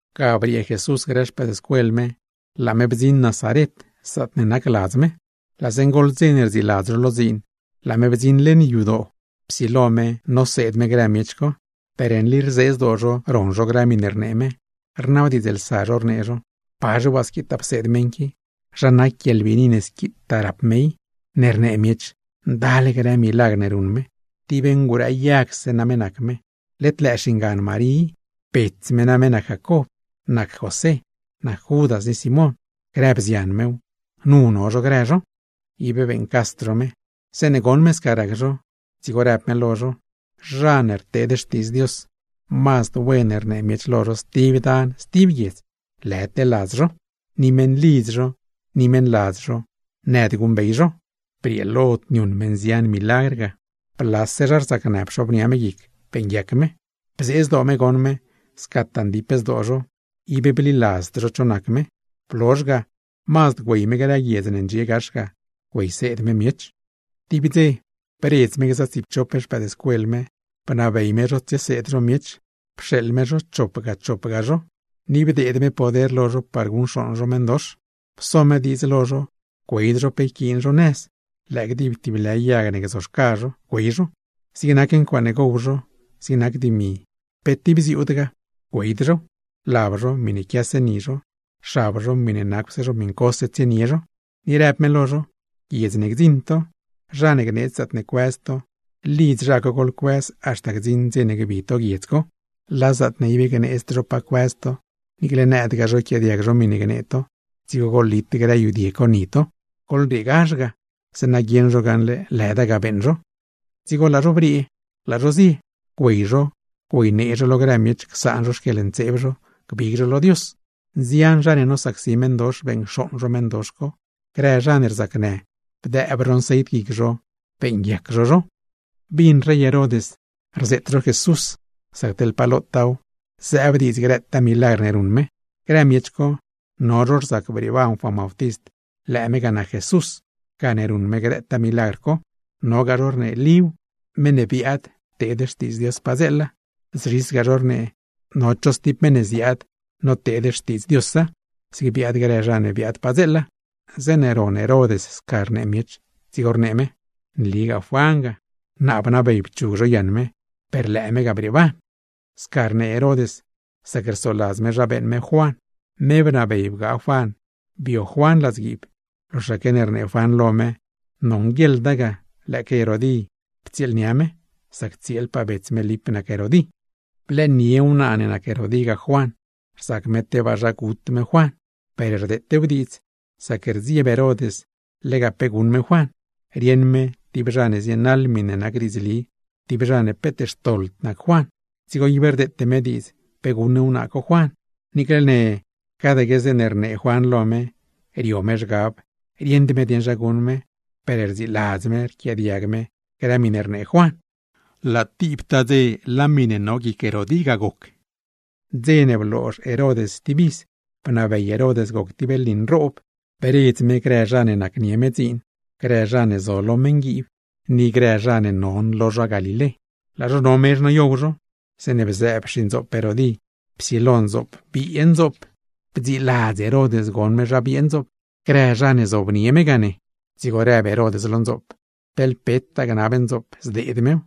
Ga briee Jesús grë xpëëdscuel me, laa me bdziṉ Nazaret zaatne nac ladz me. Laa zeeṉe goḻ dze ne rdziiladz zho lo dziin, laa me bdziṉ leṉ yadoo, psilo me pseed me grë miech co. Per nli rzee zdoo zho ron zho grë miṉe rnee me, rnabdiidzlsa zho rnee zho: ―¿Pazhe waa squitaa pseed meṉ qui? ¿Zha nac guieḻbiini ne squitaa rap me i, ne rnee miech ndal grë milagr ne ruṉ me? Tib ngurëëyagse name nac me. Led lëë xingan Marí i, bets me name nac Jacob, nac José, nac Judas ni Simón, grë bzian mew, nu no zho grë zho. Ib beeṉcasd zho me. Zeeṉe goṉ me sca rac zho, dzigo rëb me lo zho: ―Zha ne rteed xtiidz Dios, mazd wen rnee miech lo zho stib dan, stib guiedz, lëdle ladz zho, ni meṉlidz zho ni meṉladz zho nëd guṉbey zho. Brieelod niuṉ me nzian milagr ga, blase zha rzacnë pxobnia me guic, beeṉguiac me. Bzee zdoo me goṉ me scataa ndip zdoo zho, ib bliladzd zho cho nac me. Blozh ga mazd güey me grë guiedz ne ndxie gax ga, güeyseed me miech. Tib dze, bredz me gza tsiipchop xpëëdscuel me, bnabey me zho tsieseed zho miech. Pxeeḻ me zho chopga chopga zho, ni bdeed me poder lo zho par guṉcxooṉ zho meṉdox. Pso me diidz lo zho güeyd zho pe yquiin zho nëz, lëë gdib tib lë yag ne gzoxca zho güey zho. Zig nac ncuaaṉe gow zho, zig nac dimi, pe tib bziuudgaa, güeyd zhow. Lab zho, miṉe quiase ni zho; xab zho, miṉe nacwse zho miṉcose tsienie zho. Ni rëb me lo zho: ―Guiedz ne gdziṉ to, zha ne gneedz zaatne cuëz to, lidz zha co goḻcuëz haxta gdziṉ dze ne gbi to guiedz co. Laa zaatne ne ib gneedzd zho pa cuëz to, niicle nëdgaa zho yquiaadiag zho miṉe gnee to, dzigo goḻlit grë yudie co ni to, goḻrieegazh ga, zeeṉa guieṉ zho gaṉle lëda ga beeṉ zho. Dzigo laa zho briee, laa zho zie. Güey zho, güeynee zho lo grë miech csaan zho xquieḻntseeb zho, gbig zho lo Dios. Nzian zha ne nosacsi meṉdox, beṉcxooṉ zho meṉdox co; grë zha ne rzacnë, bdëëb zho nceit guic zho, beeṉguiac zho zho. Bin rey Herod rzeet zho Jesús, sac teḻ pa lotaaw zëëb diidz grëtaa milagr ne ruṉ me. Grë miech co, no zho rzac brieeban Juan Bautist lëë me ga nac Jesús, gane ruṉ me grëtaa milagr co; nogaa zho rnee Líw, meṉ ne biaad pteed Xtiidz Dios padzeela; zzhisgaa zho rnee, no cho stib meṉ ne ziaad noteed Xtiidz Diosa, zig biaad grë zha ne biaad padzeela. Zeeṉe ron Herod sca rnee miech, dzigo rnee me: ―Nligaa Juan ga. Naa bnabey pchug zho yaṉ me, per lëë me ga brieeban. Sca rnee Herod sac rsoladz me zha beeṉ me Juan. Me bnabey bgaa Juan bio Juan ladzguiib, loxaque ne rnee Juan lo me nonguieḻda ga lëëque Herodí ptsieelnia me; sac tsieelpaa bets me Lip nac Herodí. Blëënie wnaa ne nac Herodí ga Juan, rzac me tebaa zha gut me Juan; per rdeetew diidz, sac rdzieb Herod lega pe guṉ me Juan, rieṉ me tib zha ne zienaḻ miṉe nac diidzli, tib zha ne peet xtoḻd nac Juan; dzigo ib rdeete me diidz pe guṉ wnaa co Juan. Niicle ne cadque zeeṉe rnee Juan lo me, rio me zhgab rieṉd me dieṉ zha guṉ me, per rdziladz me rquiaadiag me grë miṉe rnee Juan. Laa tibtaa dze laa miṉe no guic Herodí ga goc. Dze ne bloozh Herod stib iz, bnabey Herod goc tib lni nroob, bredz me grë zha ne nacnie me dziin, grë zha ne zo lo meṉguiib, ni grë zha non lo zha Galilé. Laa zho no mezh noyow zho, zeeṉe bzëëb xindzoop Herodí psilo ndzoop biee ndzoop. Bdziladz Herod goṉ me zha biee ndzoop, grë zha ne zob lo mezh ga ne. Dzigo rëb Herod lo ndzoop, teḻ petaa gnab ndzoop zdeed mew;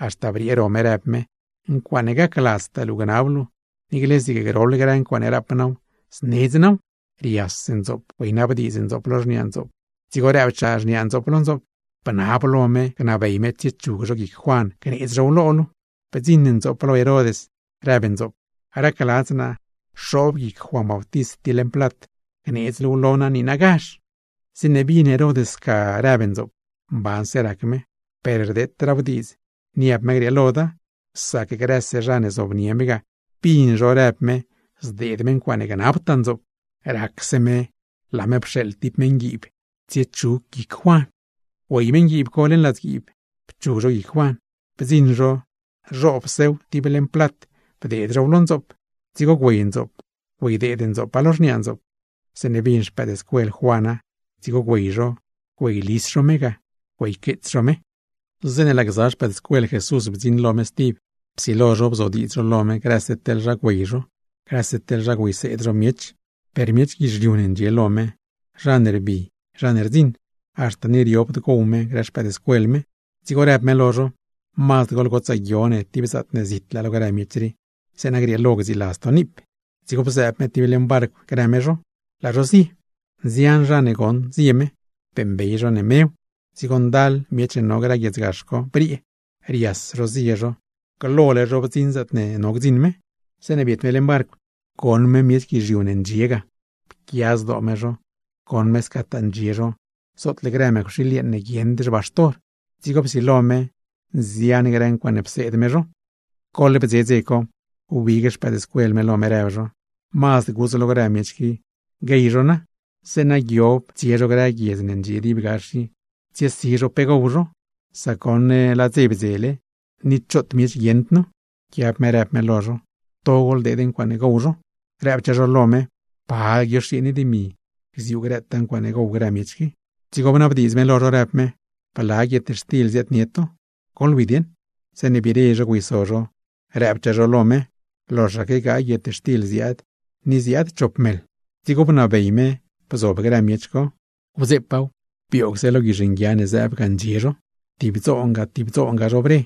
haxta briee ro me rëb me: ―Ncuaaṉe gacladztaa luu gnab luu, niicle zig groḻ grë ncuaaṉe rap naaw, znedz naaw. Rias ndzoop güeynabdiidz ndzoop lo xniaa ndzoop. Dzigo rëbchaa me lo ndzoop: ―Bnab lo me gnabey me tsiechug zho guic Juan gneedz zhow lo luu. Bdziṉ ndzoop lo Herod rëb ndzoop: ―Racladz naa xoob guic Juan Bautist tib leṉ plat, gneedz luuw lo naa niinagazh. Zeeṉe bin Herod sca rëb ndzoop, mbanse rac me; per rdeetraaw diidz niab me grieeloda, sac grëse zha ne zobnie me ga, bin zho rëb me zdeed me ncuaaṉe gnabtaa ndzoop. Dzigo racse me pxeeḻ me tib meṉguiib ne tsiechug guic Juan. Güey meṉguiib co leṉ ladzguiib pchug zho guic Juan. Bdziṉ zho, zhoobsew tib leṉ plat bdeed zhow lo ndzoop, dzigo güey ndzoop güeydeed ndzoopa lo xniaa ndzoop. Zeeṉe bin xpëëdscuel Juana, dzigo güey zho güeylis zho me ga güeyqueets zho me. Zeeṉe laa gza xpëëdscuel Jesús bdziṉ lo me stib, psilo zho bzodiidz zho lo me grëse teḻ zha güey zho, grëse teḻ zha güeyseed zho miech. Per miech guizhiu ne ndxie lo me, zha ne rbi, zha ne rdziṉ; haxta ni riobd gow me grë xpëëdscuel me. Dzigo rëb me lo zho: ―Mazd goḻgotsaa guio ne tib zaatne zitlaa lo grë miech rii, zeeṉa grieelo gdziiladz to niip. Dzigo bzëëb me tib leṉ barcw grë me zho, laa zho zie. Nzian zha ne goṉ zie me, beeṉbey zho ne mew. Dzigo ndal miech ne no grë guiedz gax co briee, rias zho zie zho glole zho bdziṉ zaatne no gdziṉ me. Zeeṉe biet me leṉ barcw, goṉ me laa grë miech guizhiu co ndxiele ga. Pquia zdoo me zho goṉ me scataa ndxie zho zootle grë mëcwxiil yeeṉ ne guieṉd xbaxtor, dzigo psilo me nzian grë ncuaaṉe pseed me zho. Goḻ bdze dze co, wbig xpëëdscuel me lo me rëb zho: ―Mazd gudz lo grë miech qui guey zho na, zeeṉa guiob tsie zho grë guiedz ne ndxie dib gax i, tsiesi zho ncuaaṉe gow zho; sac goṉ laa dze bdzele, ni choot miech guieṉd nu. Pquiab me rëb me lo zho: ―To goḻdeed ncuaaṉe gow zho. Rëbchaa zho lo me: ―¿Pe zhizhe dimi ne yquiin gziuu guietxtil ne gow grëtaa miech qui? Dzigo bnabdiidz me lo zho, rëb me: ―¿Bla guietxtil ziaadnie to? ¡Goḻwi dieṉ! Zeeṉe biire zho güeyso zho, rëbchaa zho lo me: ―Loxaque gaay guietxtil ziaad, ni ziaad chop meḻ. Dzigo bnabey me bzob grë miech co, wdzeepaaw bioogse lo guizh nguia ne zëëb ga ndxie zho. Tib dzoonga tib dzoonga zho bre,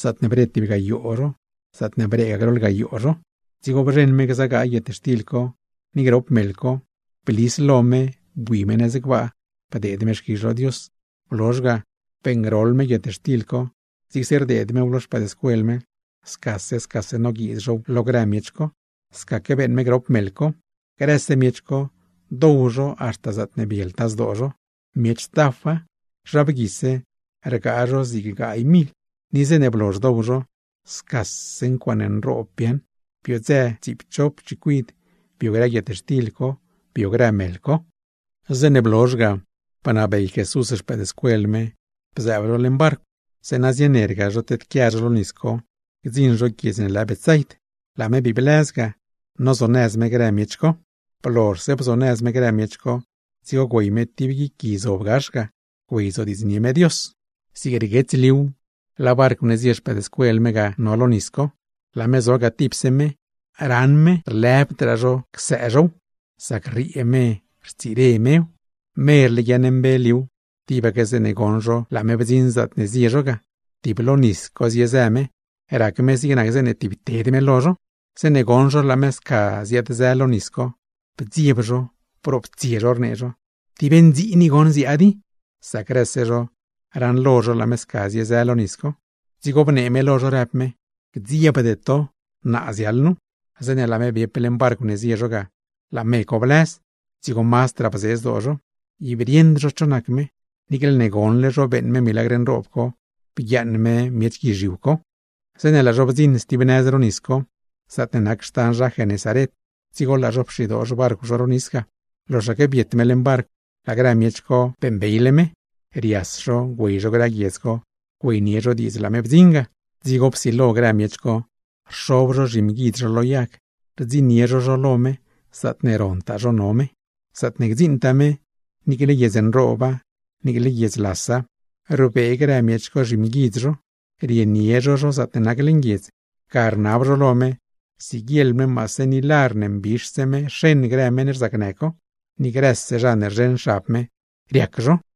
zaatne bre tib gayoo zho, zaatne breegaa groḻ gayoo zho. Dzigo bzheṉ me gza gaay guietxtil co, ni grop meḻ co, blis lo me bui me nëz gbaa, bdeed me xquizh lo Dios. Blozh ga, beeṉgroḻ me guietxtil co, zigse rdeed mew lo xpëëdscuel me, scase scase noguiiz zhow lo grë miech co. Scaque beeṉ me grop meḻ co. Grëse miech co, dow zho haxta zaatne bieltaa zdoo zho. Miech tafa, zha bguise rgaa zig gaay mil; ni zeeṉe blozh dow zho, scase ncuaaṉe nroob biaaṉ, biodzë tsiipchop chicuid bio grë guietxtil co, bio grë meḻ co. Zeeṉe blozh ga, bnabey Jesús xpëëdscuel me bzëëb zho leṉ barcw, zeeṉa zienerga zho tedquia zho stib nëz ro nis co, gdziṉ zho guiedz ne lë Betsaid; laa me bii blëz ga, nozonëz me grë miech co. Blozhse bzonëz me zho, dzigo güey me tib guic gui zob gax ga, güeyzodiidznie me Dios. Zig rguets liuw, laa barcw ne zie xpëëdscuel me ga no lo nis co. Laa me zo ga tipse me, raṉ me rlu ib gacd csëëniob zhow, sac rriee me rtsire mew. Merle guimbe liuw, tibaque zeeṉe goṉ zho laa me bdziṉ zaatne zie zho ga; tib lo nis co ziezë me, rac me zig nac zeeṉe tibted me lo zho. Zeeṉe goṉ zho laa meṉ co sca ziaad-zë lo nis co, bdzieb zho, broptsie zho rnee zho: ―¡Tib ndziin i goṉ ziaad i! Sac grëse zho raṉlo zho laa me sca ziezë lo nis co. Dzigo bnee me lo zho rëb me: ―¡Gdziebde to, naa ziaḻ nu! Zeeṉe laa me biep leṉ barcw ne zie zho ga, laa me co blëz; dzigo mazdraa bzee zdoo zho. ¡Per ib rieṉd zho cho nac me, niicle ne goṉle zho beeṉ me milagr nroob co bguiaaṉ me miech guizhiu co! Zeeṉe laa zho bdziṉ stib nëz ro nis co, zaatne nac xtan zha Genesaret, dzigo laa zho pxidoo xbarcw zho ro nis ga. Loxaque biet me leṉ barcw laa grë miech co beeṉbeyle me. Rias zho güey zho grë guiedz co, güeynie zho diidz laa me bdziṉ ga. Dzigo psilo grë miech co rxob zho zhimguidz zho lo yag, rdziṉnie zho zho lo me zaatne rontaa zho no me. Zaatne gdziṉtaa me, niicle guiedz nrooba, niicle guiedz lasa, rbee grë miech co zhimguidz zho rienie zho zho zaatne nac leṉ guiedz; ga rnab zho lo me siguieḻ me maase ni lar ne mbixse me xeṉ grë meṉ rzacnë co. Ni grëse zha ne rzheṉ xab me, riac zho.